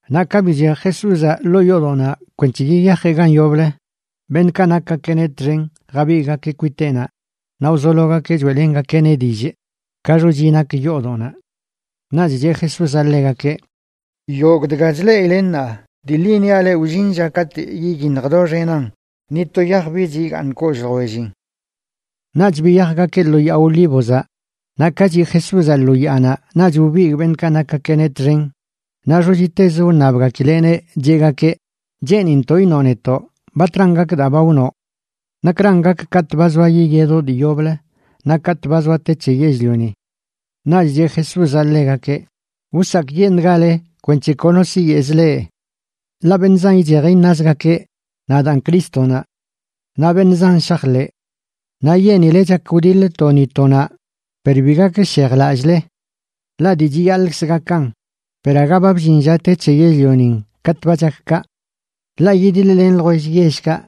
Naꞌ ka bichej Jesúzaꞌ ḻoo yoodoꞌnaꞌ kwenc̱he yiyajeꞌ gan yoblə, beṉꞌkaꞌ nakgakeꞌneꞌ txen jabigꞌgakeꞌ kwiteꞌnaꞌ naꞌ wzologakeꞌ choeꞌlengakeꞌneꞌ dillꞌ ka xochi nak yoodoꞌnaꞌ. Naꞌch cheꞌ Jesúzaꞌ ḻegakeꞌ: ―Yogꞌ dga chleꞌile ṉaa, dii ḻi niaꞌ leꞌ wllin lla katꞌ yiyiṉj doxenan, ni to yaj bich igaaṉ kollꞌ ljwellin. Naꞌch biyajgakeꞌ lo Yaa Olívozaꞌ, naꞌ ka chiꞌ Jesúzaꞌ lo yaanaꞌ naꞌch wbigꞌ beṉꞌkaꞌ nakgakeꞌneꞌ txen naꞌ xochitezə wṉabgakileꞌneꞌ, cheꞌgakeꞌ: ―Cheenintoꞌ iṉoꞌ netoꞌ batran gak daa ba wnoꞌ. ¿Nakran gak katꞌ ba zoa yiyedoꞌ dii yoblə naꞌ katꞌ ba zoa te c̱he yell-lioni? Naꞌch cheꞌ Jesúzaꞌ ḻegakeꞌ: ―Wsakꞌyeṉꞌgale kwenc̱he kono siyeꞌz leꞌ. Ḻaꞌ beṉꞌ zan ichej iṉazgakeꞌ: “Nadaan Crístonaꞌ.” Naꞌ beṉꞌ zan shajḻeꞌ. Naꞌ yenile chak wdiḻ to ni to naꞌ, per bi gakshejlallꞌle. Ḻaꞌ dii chiyaḻꞌkz gakan, per aga ba bllin lla te c̱he yell-lionin katꞌ ba chak kaꞌ. Ḻaꞌ yidiḻ-len ljwell yellkaꞌ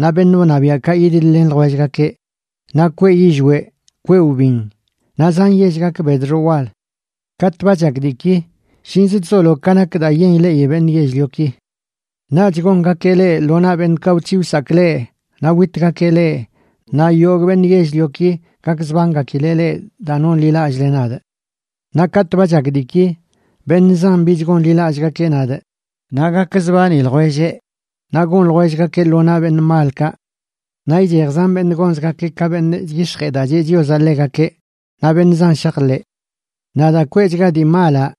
naꞌ beṉꞌ wṉabiaꞌkaꞌ yidiḻ-len ljwellgakeꞌ, naꞌ kweꞌ yillweꞌ, kweꞌ wbin, naꞌ zan yell gak bedxoꞌ wal. Katꞌ ba chak diiki, shinz chzolo ka nak daa yen ileꞌi beṉꞌ yell-lioki. ’Naꞌch gongakeꞌ leꞌ lo naꞌ beṉꞌkaꞌ wc̱hiꞌ wsakꞌ leꞌ, naꞌ witgakeꞌ leꞌ, naꞌ yogꞌ beṉꞌ yell-lioki gakzbangakileꞌ leꞌ daa nonḻilallꞌle nadꞌ. Naꞌ katꞌ ba chak diiki beṉꞌ zan bich gonḻilallꞌgakeꞌ nadꞌ, naꞌ gakzbani ljwelleꞌ naꞌ gon ljwellgakeꞌ lo naꞌ beṉꞌ malkaꞌ. Naꞌ ichej zan beṉꞌ gonzgakeꞌ ka beṉꞌ chyix̱jee daa cheꞌ Chiozaꞌ ḻegakeꞌ, naꞌ beṉꞌ zan shajḻeꞌ. Naꞌ daa kweꞌchachga dii malaꞌ,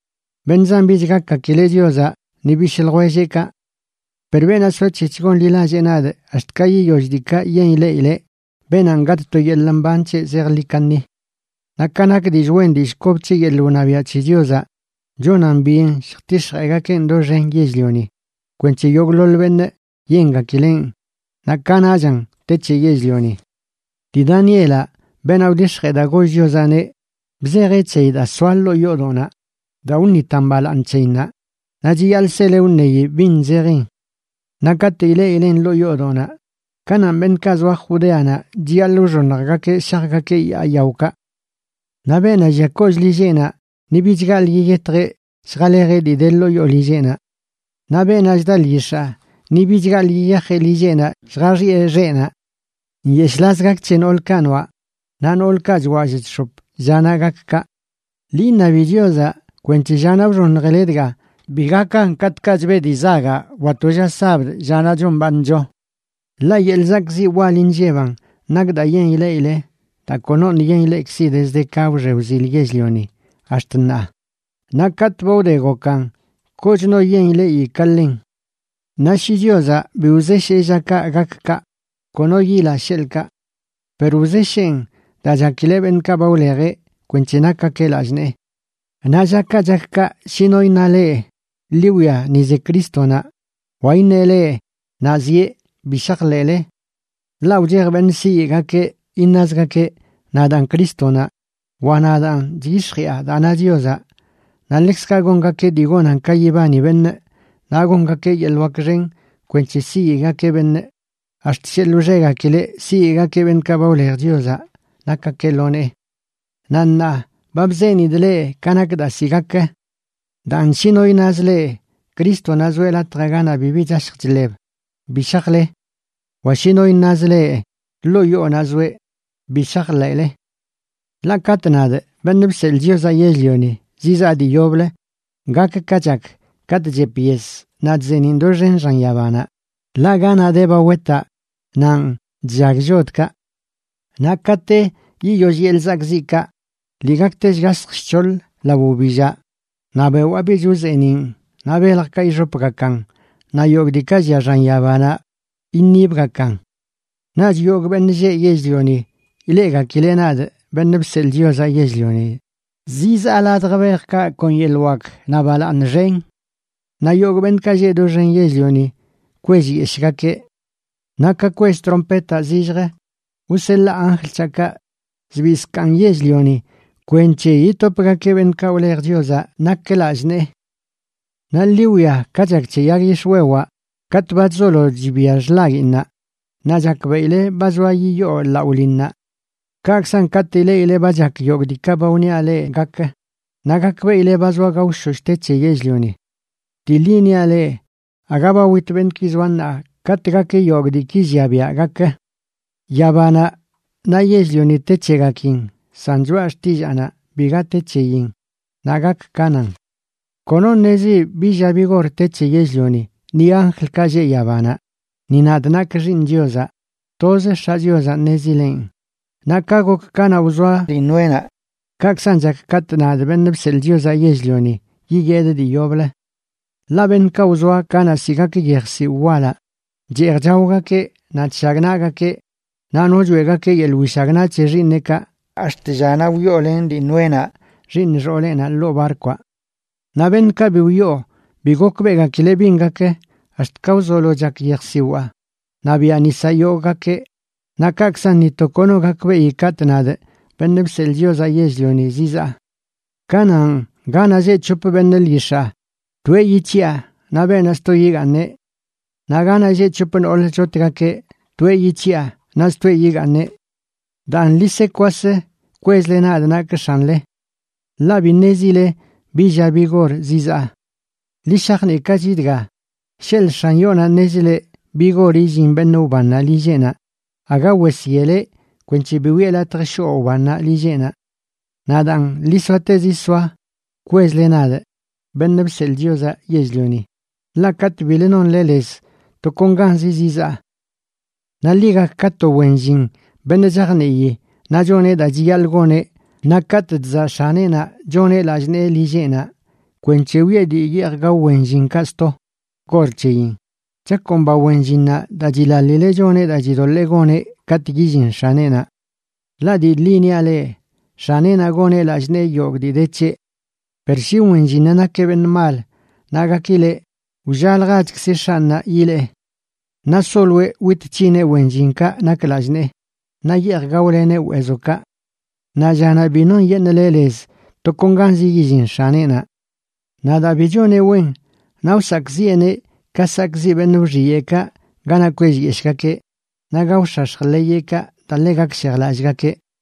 beṉꞌ zan bich gakgakileꞌ Chiozaꞌ ni bishꞌ ljwelleꞌkaꞌ. Per beenaꞌ soac̱hec̱h gonḻilallee nadꞌ ax̱t ka yiyoll diikaꞌ yen ileꞌileꞌ, beenanꞌ gatꞌ to yeḻꞌ mban c̱heꞌ zejḻi kaṉi. Naꞌ ka nak dillꞌ wen dillꞌ kob c̱he yeḻꞌ wṉabiaꞌ c̱he Chiozaꞌ, chonan byen lljtix̱jeegakeꞌn doxen yell-lioni kwenc̱he yogꞌḻoḻ beṉꞌ yengakileꞌn, naꞌ kanaꞌchan te c̱he yell-lioni. ’Dii Danielaꞌ, beenaꞌ wdix̱jee daa goll Chiozaꞌneꞌ, bzejeꞌ c̱heyi daa soa ḻoo yoodoꞌnaꞌ daa wṉitan balaaṉ c̱heyinnaꞌ, naꞌ chiyaḻꞌ sele wṉeyi bin zejin. Naꞌ katꞌ ileꞌileꞌn ḻoo yoodoꞌnaꞌ kananꞌ beṉꞌkaꞌ zoa Judeanaꞌ chiyaḻꞌ wxoṉjgakeꞌ shajgakeꞌ yaa yaokaꞌ. Naꞌ beenaꞌ llia kollꞌ lilleꞌnaꞌ ni bich gaḻꞌ yiyetjeꞌ lljalejeꞌ dii de ḻoo yoo lilleꞌnaꞌ. Naꞌ beenaꞌ chda lyix̱aa ni bich gaḻꞌ yiyajeꞌ lilleꞌnaꞌ lljaxiꞌe xeꞌnaꞌ. ¡Nyeshꞌlaz gak c̱he noolkaꞌ noaꞌ naꞌ noolkaꞌ chwallꞌ chx̱op llanaꞌ gak kaꞌ! Ḻi iṉabi Chiozaꞌ kwenc̱he llanaꞌ wxoṉjile dga bi gakan katꞌkaꞌ chbeꞌ dii zagaꞌ wa to lla sabd, llanaꞌ chombaaṉcho. Ḻaꞌ yeḻꞌ zakꞌziꞌ wal inlleban nak daa yen ileꞌile, daa konoṉꞌ yen ileꞌkzi dezd ka wxe wzil yell-lioni ax̱t ṉaa, naꞌ katꞌ ba wde gokan kochno yen ileꞌi ka ḻen. Naꞌ shi Chiozaꞌ bi wzeshee llakaꞌ gak kaꞌ, kono yila, sheḻꞌkaꞌ. Per wzesheen daa chakileꞌ beṉꞌkaꞌ ba wlejeꞌ kwenc̱he nakgakeꞌ lallꞌ nee. ’Naꞌ llakaꞌ chak kaꞌ shi no iṉa leꞌ: “Ḻi wwia, ni ze Crístonaꞌ”, wa iṉeꞌ leꞌ: “Naꞌ zieꞌ”, bi shajḻeꞌle. Ḻaꞌ wchej beṉꞌ siyeꞌgakeꞌ, iṉazgakeꞌ: “Nadaan Crístonaꞌ”, wa “Nadaan chyix̱jiꞌa daa na Chiozaꞌ”. Naꞌ ḻekzkaꞌ gongakeꞌ dii gonan ka yibani beṉꞌ, naꞌ gongakeꞌ yeḻꞌ wak xen kwenc̱he siyeꞌgakeꞌ beṉꞌ, ax̱t sheḻꞌ wxegakileꞌ siyeꞌgakeꞌ beṉꞌkaꞌ ba wlej Chiozaꞌ nakgakeꞌ lo nee. Naꞌ ṉaa ba bzenidꞌ leꞌ ka nak daa ziꞌ gak. Daan shi no iṉaz leꞌ: “Crístonaꞌ zoeꞌ latjaꞌ ganaꞌ bibi chashj chḻeb”, bi shajle; wa shi no iṉaz leꞌ: “Ḻoo yoonaꞌ zoeꞌ”, bi shajḻeꞌle. Ḻaꞌ katꞌ nadꞌ, Beṉꞌ Bseḻꞌ Chiozaꞌ Yell-lioni, zizaa dii yoblə, gak ka chak katꞌ chep yes naꞌ chzeeniꞌn doxen xan yabanaꞌ. Ḻaꞌ ganaꞌ de ba wetaꞌ nanꞌ chllag llodkaꞌ. ’Naꞌ kate yiyoll yeḻꞌ zakꞌziꞌkaꞌ, lii gakte shgasj shc̱hoḻ lao wbillaꞌ naꞌ bewaa bich wzeeniꞌn naꞌ beljkaꞌ ixopgakan, naꞌ yogꞌ diikaꞌ llia xan yabanaꞌ iṉibgakan. Naꞌch yogꞌ beṉꞌ lleꞌ yell-lioni ileꞌgakileꞌ nadꞌ, Beṉꞌ Bseḻꞌ Chiozaꞌ Yell-lioni, zizaa ladj bejkaꞌ kon yeḻꞌ wak naꞌ balaaṉ xen. Naꞌ yogꞌ beṉꞌkaꞌ lleꞌ doxen yell-lioni kwellyeshꞌgakeꞌ. Naꞌ ka kwell trompetaꞌ zillj wseḻaa anjl c̱haꞌkaꞌ zbii zkaaṉ yell-lioni kwenc̱he yitopgakeꞌ beṉꞌkaꞌ wlej Chiozaꞌ nak lallꞌ nee. ’Naꞌ ḻi wwia ka chak c̱he yag yix̱wewaꞌ: katꞌ ba chzolo chibia xḻaguiinnaꞌ, naꞌ chakbeꞌile ba zoa yiyoo laꞌo linnaꞌ. Kaꞌkzan, katꞌ ileꞌile ba chak yogꞌ diikaꞌ ba wniaꞌ leꞌ gakə, naꞌ gakbeꞌile ba zoa gaoshosh te c̱he yell-lioni. Dii ḻi niaꞌ leꞌ, aga ba wit beṉꞌki zoa ṉaa katꞌ gak yogꞌ diiki llia biaꞌ gakə. Yabanaꞌ naꞌ yell-lioni te c̱hegakin, san choꞌa xtillaanaꞌ biga te c̱heyin naꞌ gak ka nan. ’Kono ṉezi bi lla bi gor te c̱he yell-lioni, ni anjlkaꞌ lleꞌ yabanaꞌ, ni nadꞌ nakꞌ Xiiṉ Chiozaꞌ. Toz X̱aꞌ Chiozaꞌ ṉezileꞌn. ’Naꞌ ka gok kanaꞌ wzoa dii Noénaꞌ, kaꞌkzan chak katꞌ nadꞌ, Beṉꞌ Bseḻꞌ Chiozaꞌ Yell-lioni, yiyedꞌ dii yoblə. Ḻaꞌ beṉꞌkaꞌ wzoa kanaꞌ ziꞌ gak yej ziwꞌ walaꞌ, cheej chaogakeꞌ, naꞌ chshagnaꞌgakeꞌ naꞌ no choeꞌgakeꞌ yeḻꞌ wishagnaꞌ c̱he xiiṉeꞌkaꞌ ax̱t llanaꞌ wyoolen dii Noénaꞌ xiiṉ xooleꞌnaꞌ ḻoo barkwaꞌ. Naꞌ beṉꞌkaꞌ bi wyoo bi gokbeꞌgakileꞌ bin gak ax̱t ka wzolo chak yejsiwaa naꞌ biaꞌ nisaꞌ yogꞌgakeꞌ. Naꞌ kaꞌkzan ni to kono gakbeꞌi katꞌ nadꞌ, Beṉꞌ Bseḻꞌ Chiozaꞌ Yell-lioni, zizaa. Kanaꞌn, ganaꞌ lleꞌ c̱hop beṉꞌ lyix̱aa, toeꞌ yic̱hiꞌa naꞌ beenaꞌ sto yigaaṉeꞌ. Naꞌ ganaꞌ lleꞌ c̱hop noolə chotgakeꞌ, toeꞌ yic̱hiꞌa naꞌ stoeꞌ yigaaṉeꞌ. ’Daan ḻi se kwas kwezle nadꞌ nakꞌ X̱anle, ḻaꞌ bi ṉezile bi lla bi gor zizaa. Ḻi shajniꞌkachi dga, sheḻꞌ x̱an yoonaꞌ ṉezileꞌ bi gor illin beṉꞌ wbannaꞌ lilleꞌnaꞌ, aga wes yeleꞌ kwenc̱he bi wiꞌe latj shoꞌ wbannaꞌ lilleꞌnaꞌ. Naꞌ daan, ḻi soatezi soa kwezle nadꞌ, Beṉꞌ Bseḻꞌ Chiozaꞌ Yell-lioni, ḻaꞌ katꞌ bilə nonle lez, tokonganzi zizaa. ’Naꞌ ḻi gak ka to wen llin beṉꞌ chajnii naꞌ choneꞌ daa chiyaḻꞌ goneꞌ naꞌ katꞌ chzaꞌ x̱aneꞌnaꞌ choneꞌ lallꞌ nee lilleꞌnaꞌ kwenc̱he wiꞌe dii yeej gao wen llinkaꞌ sto gor c̱heyin. Chakomba wen llinnaꞌ daa chilaḻileꞌ choneꞌ daa chidoḻee goneꞌ katꞌ yillin x̱aneꞌnaꞌ. Ḻaꞌ dii ḻi niaꞌ leꞌ, x̱aneꞌnaꞌ goneꞌ lallꞌ nee yogꞌ dii de c̱heꞌ. Per shi wen llinnaꞌ nakeꞌ beṉꞌ mal naꞌ gakileꞌ: “Wllaljachkzi x̱anꞌnaꞌ yilee.” Naꞌ soloeꞌ wit c̱hineꞌ wen llinkaꞌ nak lallꞌ nee naꞌ yeej gaoleneꞌ weezokaꞌ. Naꞌ llanaꞌ bi nonyeṉꞌleꞌ lez, tokonganz yillin x̱aneꞌnaꞌ. Naꞌ daa bi choneꞌ wen, naꞌ wsakꞌziꞌeneꞌ ka sakꞌziꞌ beṉꞌ wxiyeꞌkaꞌ ganaꞌ kwellyeshꞌgakeꞌ naꞌ gaox̱ax̱j ḻeyeꞌkaꞌ daa ḻe gakshejlallꞌgakeꞌ.